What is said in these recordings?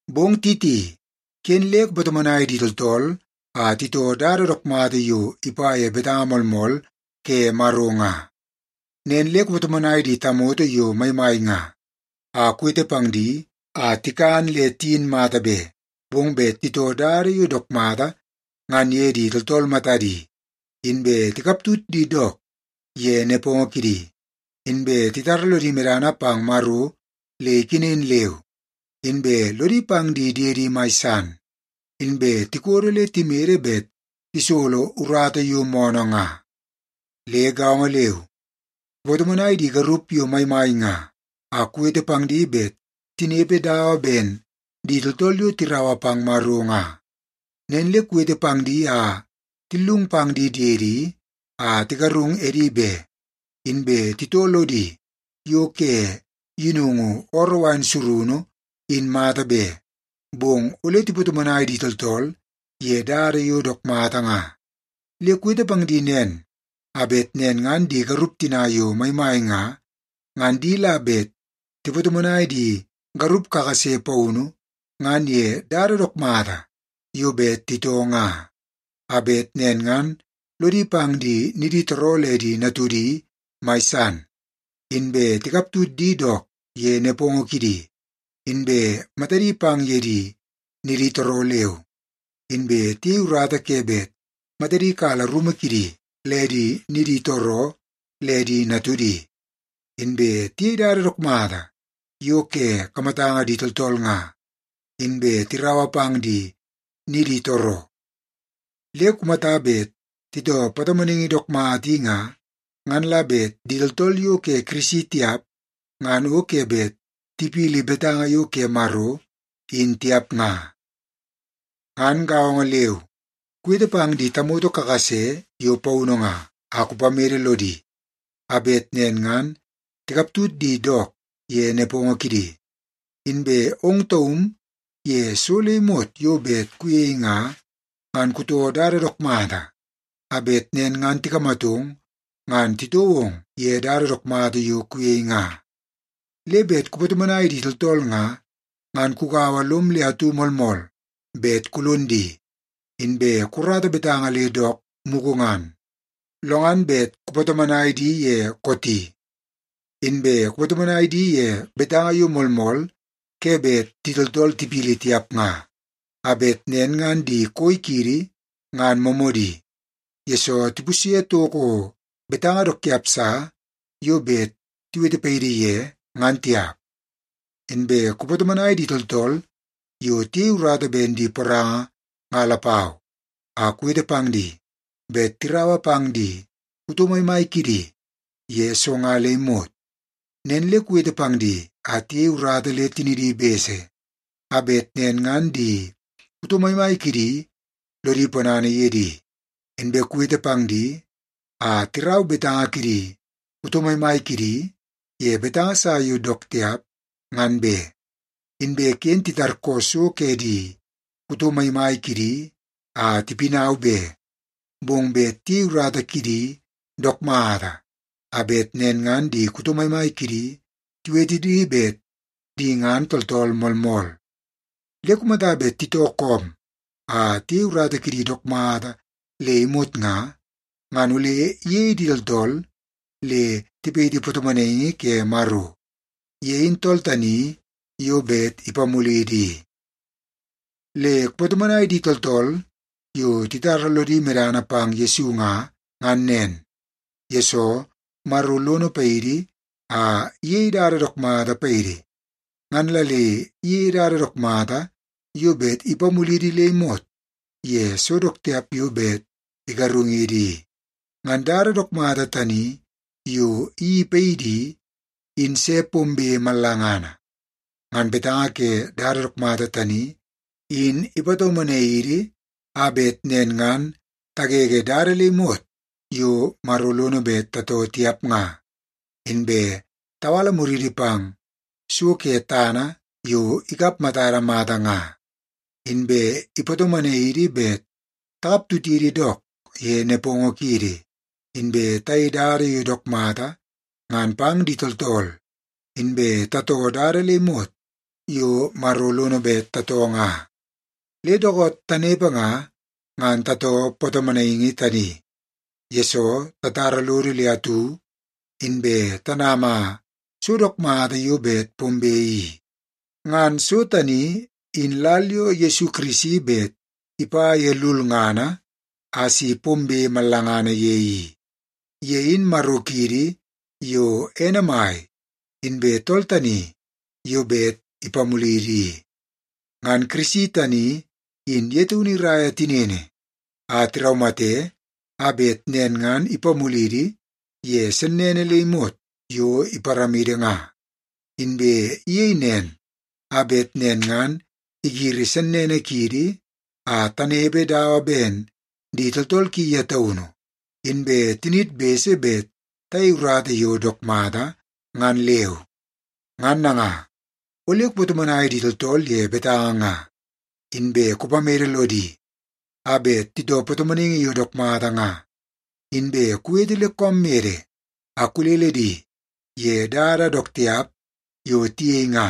Bong Titi, ken le kupatomonai di tooltool a titoo dada dook mata yo ipa ye betanga moolmool ke Maro nga. Nen le kupatomonai di tamoto yo maimai nga, a kuwete pang di a tikan le tiyin mata be, bong bet titoo dada yo dook mata ngan ye di tooltool matadi, inbe tikaptut di dook ye nepongo kidi, inbe titara lodi medana pang Maro le ikenen leu, inbe lodi pang di diedi mai san, inbe tikodo le timede bet tisolo urata yo moonoo nga. Le gaongo leu, kupatomonai di garup yo maimai nga, a kuwete pang di bet tinepe dawa ben di tooltool yo tiraua pang Maro nga. Nen le kuwete pang di a tillung pang di diedi a tigarung edi be, inbe titoo lodi yo ke yinungu ooroo wain surunu in mata be, bong ole tipatomonai di tooltool ye dada yo dook mata nga. Le kuwete pang di nen a bet nen ngan di garup tina yo maimai nga, ngan di la bet tipatomonai di garup kakase paunu ngan ye dada dook mata yo bet titoo nga. A bet nen ngan lodi pang di niditooroo le di natudi mai san, inbe tikaptut di dook ye nepongo kidi, inbe matadi pang ye di niditooroo leu, inbe tiyei urata ke bet matadi kala rumu kidi le di niditooroo le di natudi, inbe tiyei dada dook mata yo ke kamatanga di tooltool nga, inbe tiraua pang di niditooroo. Le kumata bet titoo patomonaingi dook mata i nga, ngan la bet di tooltool yo ke Kirisi tiap, ngan o ke bet tipili betanga yo ke Maro in tiap nga. Ngan gaongo leu, kuwete pang di tamoto kakase yo paunu nga, a kupamede lodi a bet nen ngan tikaptut di dook ye nepongo kidi. Inbe ong taum ye so le imot yo bet kuyei nga, ngan kutoo dada dook mata a bet nen ngan tikamatong ngan titoo ong ye dada dook mata yo kuyei nga. Le bet kupatomonai di tooltool nga, ngan kugaua lom le atu moolmool bet kulon di, inbe kukarata betanga le dook mugu ngan, lo ngan bet kupatomonai di ye kooti. Inbe kupatomonai di ye betanga yo moolmool ke bet di tooltool tipili tiap nga, a bet nen ngan di koi kiidi, ngan moomoodi, yesoo tipusye toko betanga dook tiap sa yo bet tiwete paidi ye ngan tiap. Inbe kupatomonai di tooltool yo tiyei urata ben di poranga nga lapau, a kuwete pang di bet tiraua pang di kuto maimai kidi ye so nga le imot. Nen le kuwete pang di a tiyei urata le tinidi bese, a bet nen ngan di kuto maimai kidi lodi ponana ye di. Inbe kuwete pang di a tirau betanga kidi kuto maimai kidi ye betanga sa yo dook tiap ngan be, inbe ken titarkoo so ke di kuto maimai kidi a tipinau be, bong bet tiyei urata kidi dook mata a bet nen ngan di kuto maimai kidi tiwete di bet di ngan tooltool moolmool. Le kumata bet titoo koom a tiyei urata kidi dook mata le imot nga, ngan ole iyei di tooltool le tipayiti patomonaingi ke Maro. Ye in tool tani yo bet ipamulidi i. Le kupatomonai di tooltool yo titara lodi medana pang Yesu nga, ngan nen, yesoo Maro lono paidi a iyei dada dook mata paidi. Ngan la le iyeie dada dook mata yo bet ipamulidi le imot ye so dook tiap yo bet igarungidi i. Ngan dada dook mata tani yo iyeii paidi i, in se pombe mallangana. Ngan betanga ke dada dook mata tani, in ipatomonai idi a bet nen ngan tagege dada le imot yo Maro lono bet tatoo tiap nga, inbe tawala muridi pang so ke tana yo ikap matada mata nga. Inbe ipatomonai idi bet takaptutidi dook ye nepongo kiidi, inbe tayei dada yo dook mata ngan pang di tooltool, inbe tatoo dada le imot yo Maro lono bet tatoo nga. Le dookoot tanepe nga, ngan tatoo patomonaingi tani, yesoo tatara lodo le atu inbe tanama so dook mata yo bet pombe i. Ngan so tani in lal yo Yesu Kirisi bet ipa ye lulngana a si pombe mallangana ye i. Ye in Maro kiidi yo ene mai, inbe tool tani yo bet ipamulidi i. Ngan Kirisi tani in ye taunu iraia tinini a tiraumate a bet nen ngan ipamulidi ye sennene le imot yo iparamidi nga. Inbe iyei nen a bet nen ngan igiri sennene kiidi a tanepe dawa ben di tooltool ki ye taunu inbe tiniid bese bet tayei urata yo dook mata ngan leu. Ngan nanga, ole kupatomonai di tooltool ye betanga nga. Inbe kupamede lodi a bet titoo patomonaingi yo dook mata nga, inbe kuwete le koom mede a kulele di ye dada dook tiap yo tiyei nga.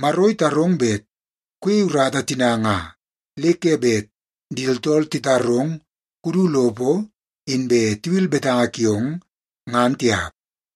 Maro itarong bet kuyei urata tina nga, le ke bet di tooltool titarong kudu lopo inbe tiwil betanga kiong, ngan tiap.